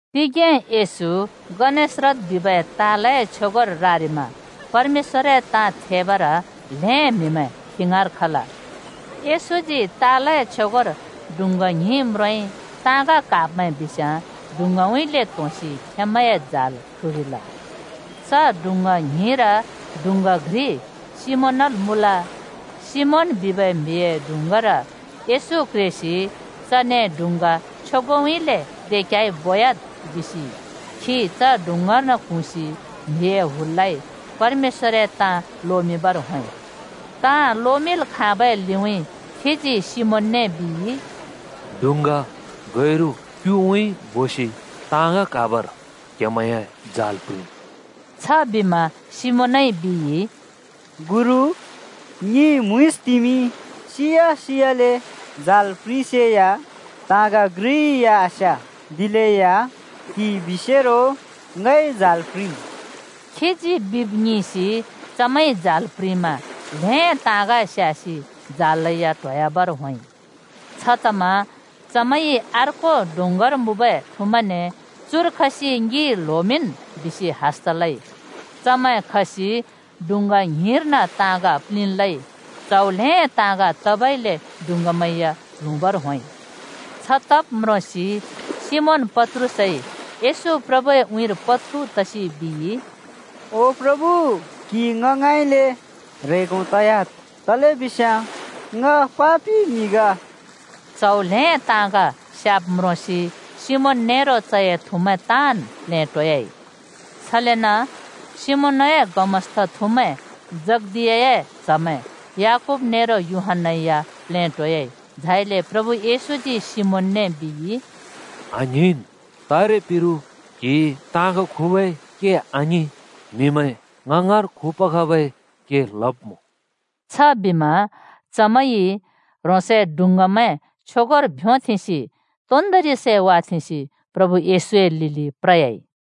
तिगें येशू गनेसरत बिबै तालए छ्योगोर रारिमा परमेश्‍वरए ताँ थेबर ल्हें म्‍हिमैं खी ङाँर खल। येशूजी तालए छ्योगोर डुँङ्गा ङ्हिं म्रोंइ। ताँग क्हाब्मैं बिस्याँ डुङ्गाउँइँले त्‍होंसि खेंमैंए जाल ख्रुरिल। च डुँङ्गा ङ्हिंर डुँङ्गा घ्रि सिमोनल् मुँल। सिमोन बिबै म्‍हिए डुँङ्गार येशू क्रेसि चने डुँङ्गा छ्योगोउँइँले दे क्‍याइ बोयाद्‍ बिसि खी च डुँङ्गार्न क्हुँसि म्‍हिए हुललाइ परमेश्‍वरए ताँ लोमिंबर होंइ। ताँ लोमिंल् खाँबै लिउँइँ खीजी सिमोनने बिइ, “डुँङ्गा गैरु क्‍युउँइँ बोसि ताँग क्हाबर क्‍हेमैंए जाल प्रिंन्।” छबिमा सिमोनइ बिइ, “गुरु, ङिइ म्‍हुँइँसतिमि सिया सियाले जाल प्रिंसेया ताँग घ्रि या आस्‍या। दिलेया क्‍हिइ बिसेरो ङइ जाल प्रिंम्।” खीजी बिब् ङिंसि चमैंइ जाल प्रिंमा ल्‍हें ताँग स्‍यासि जालैया ट्होयाबर होंइ। छतमा चमैंइ अर्को डुँङ्गार मुँबै थुमैंने “चुर खसि ङि ल्होमिंन्!” बिसि हस्‍त लइ, चमैं खसि डुँङ्गा ङ्हिंर्न ताँग प्‍लिंल् लइ, च्हौ ल्हें ताँग तबइले डुँङ्गामैं या प्ल्हुँबर होंइ। छतब् म्रोंसि सिमोन पत्रुसइ येशू प्रभुए उँइँर पत्खु तसि बिइ, “ओ प्रभु क्‍हि ङ ङाँइँले ह्रेंगो तयाद्, तलेबिस्याँ ङ पापि म्‍हि ग।” च्‍हौ ल्‍हें ताँग स्याब् म्रोंसि सिमोन नेरो चए थुमैं ताँन् प्लेटोयाइ। छलेन सिमोनए गमस्‍ता थुमैं जब्दियाए च्‍हमैं याकूब नेरो यूहन्‍ना या प्लेटोयाइ। झाइले प्रभु येशूजी सिमोनने बिइ, “आङ्हिंन्! तारे पिरु क्‍हिइ ताँग खुबै के आङिं, म्हिमैं ङ ङाँर खुपबै के लब्‍मुँ।” छबिमा चमैंइ ह्रोंसए डुँङ्गामैं छ्योगोर भ्योंथेंसि तोन्दोंरि सै वाथेंसि प्रभु येशूए लिलि प्र‍याइ।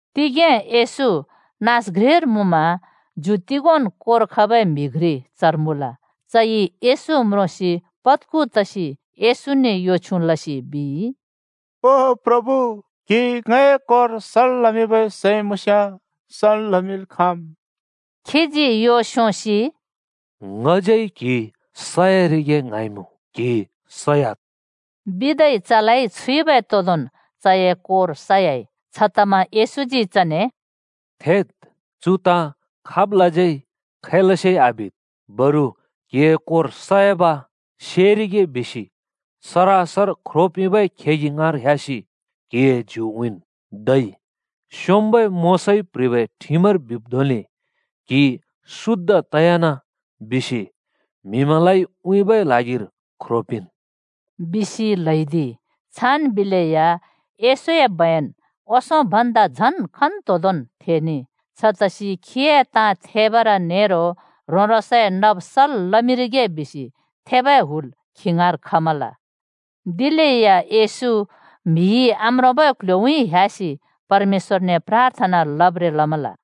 तिगें येशू नाँस घ्रिर मुँमा ज्यु तोगोंन् कोर खबै म्‍हि घ्रि चर मुँल। चइ येशू म्रोंसि पद्खु तसि येशूने यो छ्युँ लसि बिइ, “ओ प्रभु, क्‍हिइ ङए कोर सल् लमिंबै सैं मुँस्‍याँ सल् लमिल् खाँम्।” खीजी यो स्‍योंसि “ङज्यै क्हि स‍यारिगे ङ्हाँइमुँ, क्‍हि सयाद्” बिदै चलाइ छुइबै तोदोंन् चए कोर सयाइ। छतमा येशूजी चने “थेद्, चु ताँ खाबलाज्यै खैलसे आबिद्। बरु क्हिए कोर सयाब सेरिगे बिसि सरासर ख्रो पिंबै खेगि ङाँर ह्‍यासि क्‍हिए ज्यु उँइँन् धै स्‍योंम्‍बै मोशाइ प्ह्रिबै ठिमर बिब् धोंले ‘क्हि शुद्ध तयान’ बिसि म्हिमैंलाइ उँइँबै ल्हागिर ख्रो पिंन्,” बिसि ल्हैदिइ। छान् बिलेया येशूए बयन ओंसों भन्दा झन् खन्तोंदोंन् थेनेइ। छतसि खीए ताँ थेबर नेरो ह्रों-ह्रोंसए नब सल् लमिंरिगे बिसि थेबै हुल खी ङाँर खमल। दिलेया येशू म्हिइ आम्रोंबै क्‍ल्‍ह्‍योउँइँ ह्‍यासि परमेश्‍वरने प्राथना लब्‍ब्रें लमल।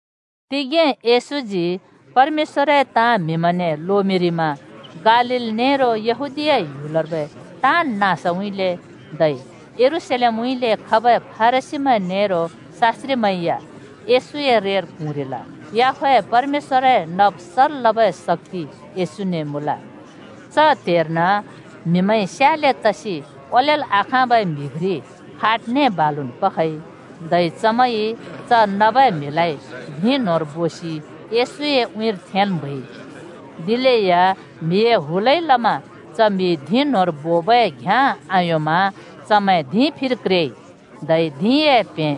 तिगें येशूजी परमेश्‍वरए ताँ म्हिमैंने लोमिंरिमा गालील नेरो यहूदीया ह्‍युलर्बै ताँन् नाँसउँइँले धै यरूशलेमउँइँले खबै फरिसीमैं नेरो शास्‍त्रिमैं या येशूए रेर क्हुँरिल। याहवेह परमेश्‍वरए नब् सल् लबै शक्‍ति येशूने मुँल। च त्हेर्न म्‍हिमैंइ स्याले तसि ओलेल् आखाँबै म्‍हि घ्रि खाटने बालुन् पखइ, धै चमैंइ च नबै म्हिलाइ धिं न्होंर बोसि येशूए उँइँर थेंल् म्हैइ। दिलेया म्हिए हुलइ लमा च म्‍हि न्‍होंर बोबै घ्‍याँ आयोंमा चमैं धिंए फिर क्रेइ, धै धिंए प्हें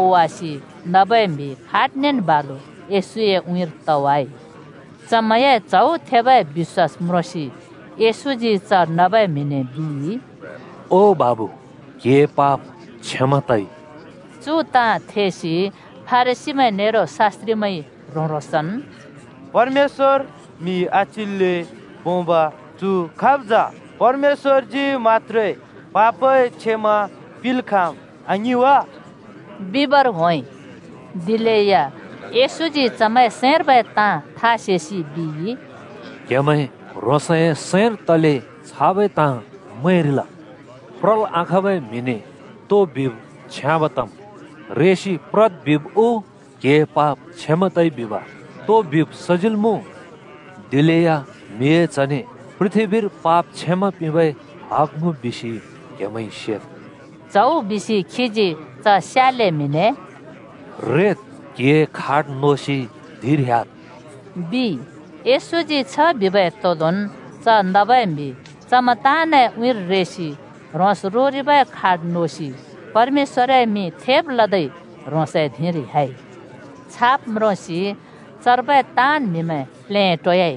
ओवासि नबै म्‍हि खाटनेन् बालु येशूए उँइँर तवाइ। चमैंए च्हौ थेबै बिश्‍वास म्रोंसि येशूजी च नबै म्हिने बिइ, “ओ बाबु, क्‍हिए पाप क्षमा तइ।” चु ताँ थेसि फरिसीमैं नेरो शास्‍त्रिमैंइ ह्रों-ह्रोंसन् “परमेश्‍वर म्‍हि आच्‍हिल्‍ले पोंब चु खाब् जा? परमेश्‍वरजी मत्‍त्रे पापए क्षमा पिंल् खाँम् आङिं वा? बिबर होंइ।” दिलेया येशूजी चमैंए सैंर्बै ताँ था सेसि बिइ, “क्‍हेमैं ह्रोंसए सैंर तले छाबै ताँ मैंरिल? प्रल् आखाँबै म्‍हिने तो बिब् छ्याँब तम्? ‘रेसि प्रद्’ बिब् उ ‘क्‍हिए पाप क्षमा तइ’ बिब तो बिब् सजिल् मुँ? दिलेया म्हिए च्हने पृथ्‍बीर पाप क्षमा पिंबै हग मुँ बिसि क्हेमैंइ सेद्।” च्हौ बिसि खीजी च स्याले म्हिने “रेद्, क्‍हिए खाट नोसि धिंर ह्‍याद्,” बिइ। येशूजी छ बिबै तोदोंन् च नबै म्‍हि चमैं ताँनए उँइँर रेसि ह्रोंस रोरिबै खाट नोसि परमेश्‍वरए मिं थेब लदै ह्रोंसए धिंर ह्‍याइ। छाब् म्रोंसि चर्बै ताँन् म्हिमैं प्लेटोयाइ।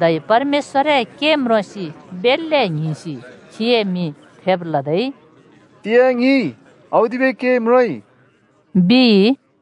धै परमेश्‍वरए के म्रोंसि बेल्‍ले ङ्हिंसि खीए मिं थेब लदै “तिंयाँ ङिंइ औदिबै के म्रोंइ,” बिइ।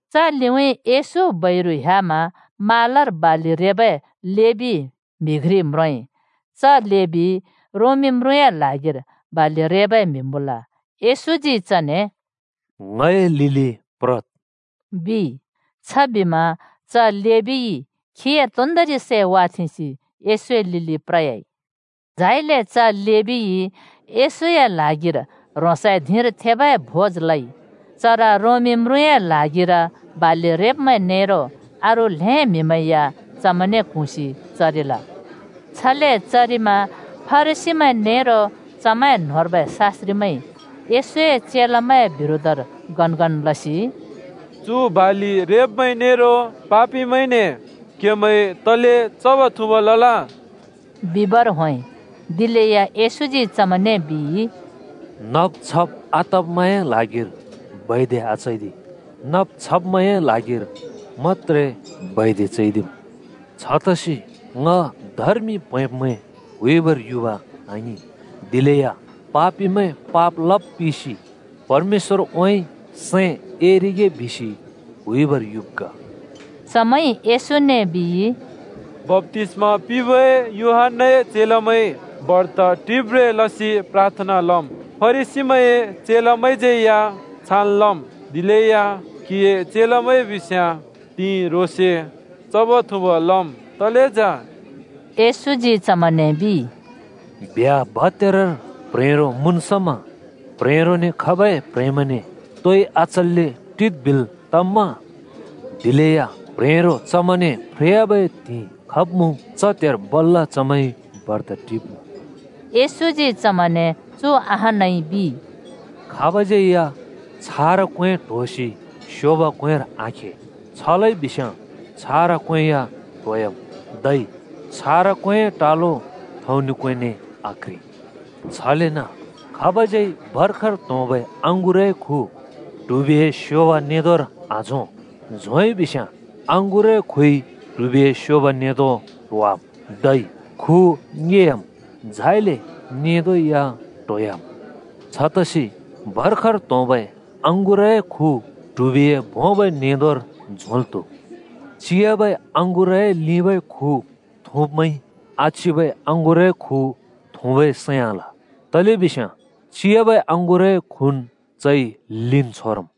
च लिउँइँ येशू बैरु ह्‍यामा म्हालार बालि रेबै लेबी म्हि घ्रि म्रोंइ। च लेबी रोमी म्रुँए ल्हागिर बालि रेबै म्हि मुँल। येशूजी चने “ङए लिलि प्रद्,” बिइ। छबिमा च लेबीइ खीए तोन्‍दोंरि सै वाथेंसि येशूए लिलि प्र‍याइ। झाइले च लेबीइ येशूए ल्हागिर ह्रोंसए धिंर थेबै भोज लइ। चर रोमी म्रुँए ल्हागिर बालि रेब्मैं नेरो अरू ल्‍हें म्‍हिमैं या चमैंने क्हुँसि चरिल। छले चरिमा फरिसीमैं नेरो चमैं न्‍होंर्बै शास्‍त्रिमैंइ येशूए चेलामैंए बिरोधर गनगन लसि “चु बालि रेब्‍मैं नेरो पापिमैंने क्‍हेमैंइ तले चब्-थुँब् लल?” बिबर होंइ। दिलेया येशूजी चमैंने बिइ, “नब् छब् आतब्मैंए ल्हागिर बैद्य आचैदि, नब् छब्मैंए ल्हागिर मत्‍त्रे बैद्य चैदिम्। छतसि ङ धर्मि प्हैंब्मैं हुइबर युब आङिं, दिलेया ‘पापिमैं पाप लब् पिसि परमेश्‍वरउँइँ सैं एरिगे,’ बिसि हुइबर युब् ग।” चमैंइ येशूने बिइ, “बप्‍तिस्मा पिंबै यूहन्‍नाए चेलामैं बर्त टिब्ब्रें लसि प्राथना लम्। फरिसीमैंए चेलामैंज्‍यै या छान् लम्, दिलेया क्‍हिए चेलामैं बिस्याँ त्हिंइ ह्रोंसे चब् थुँब् लम् तले जा?” येशूजी चमैंने बिइ, “ब्ह्‍या भत्यारर प्ह्रेंरो मुँन् समा प्ह्रेंरोने खबै प्‍ह्रेंमैंने तोइ आचल्‍ले टिद् बिल् तम्‍मा? दिलेया प्ह्रेंरो चमैंने फ्रेयाबै त्हिंइ खब्मुँ, च त्हेर बल्‍ल चमैंइ बर्त टिब्मुँ।” येशूजी चमैंने चु अहानै बिइ, “खाब‍ज्‍यै या छारा क्‍वें ट्‍होसि स्योब क्‍वेंर आखे। छ लइबिस्‍याँ छारा क्‍वें या ट्होवाम्, धै छारा क्‍वेंए टालो थौंनि क्‍वेंने आक्‍ह्रि। “छलेन खाबज्‍यै भर्खर त्होंबै अँगुरए खु ट्हुबिए स्योब नेंदोंर आझों। झोंइ बिस्‍याँ अँगुरए खुइ ट्हुबिए स्योब नेंदों ट्होवाम्, धै खु ङेयाम्, झाइले नेंदों या ट्होयाम्। छतसि भर्खर त्होंबै अँगुरए खु ट्हुबिए भोंबै नेंदोंर झोंल् त्‍हुम्। “चिबै अँगुरए लिंबै खु थुँब्मैंइ आचिबै अँगुरए खु थुँबै सैं आल। तलेबिस्याँ चिबै अँगुरए खुन् चइ लिंन् छोरम्।”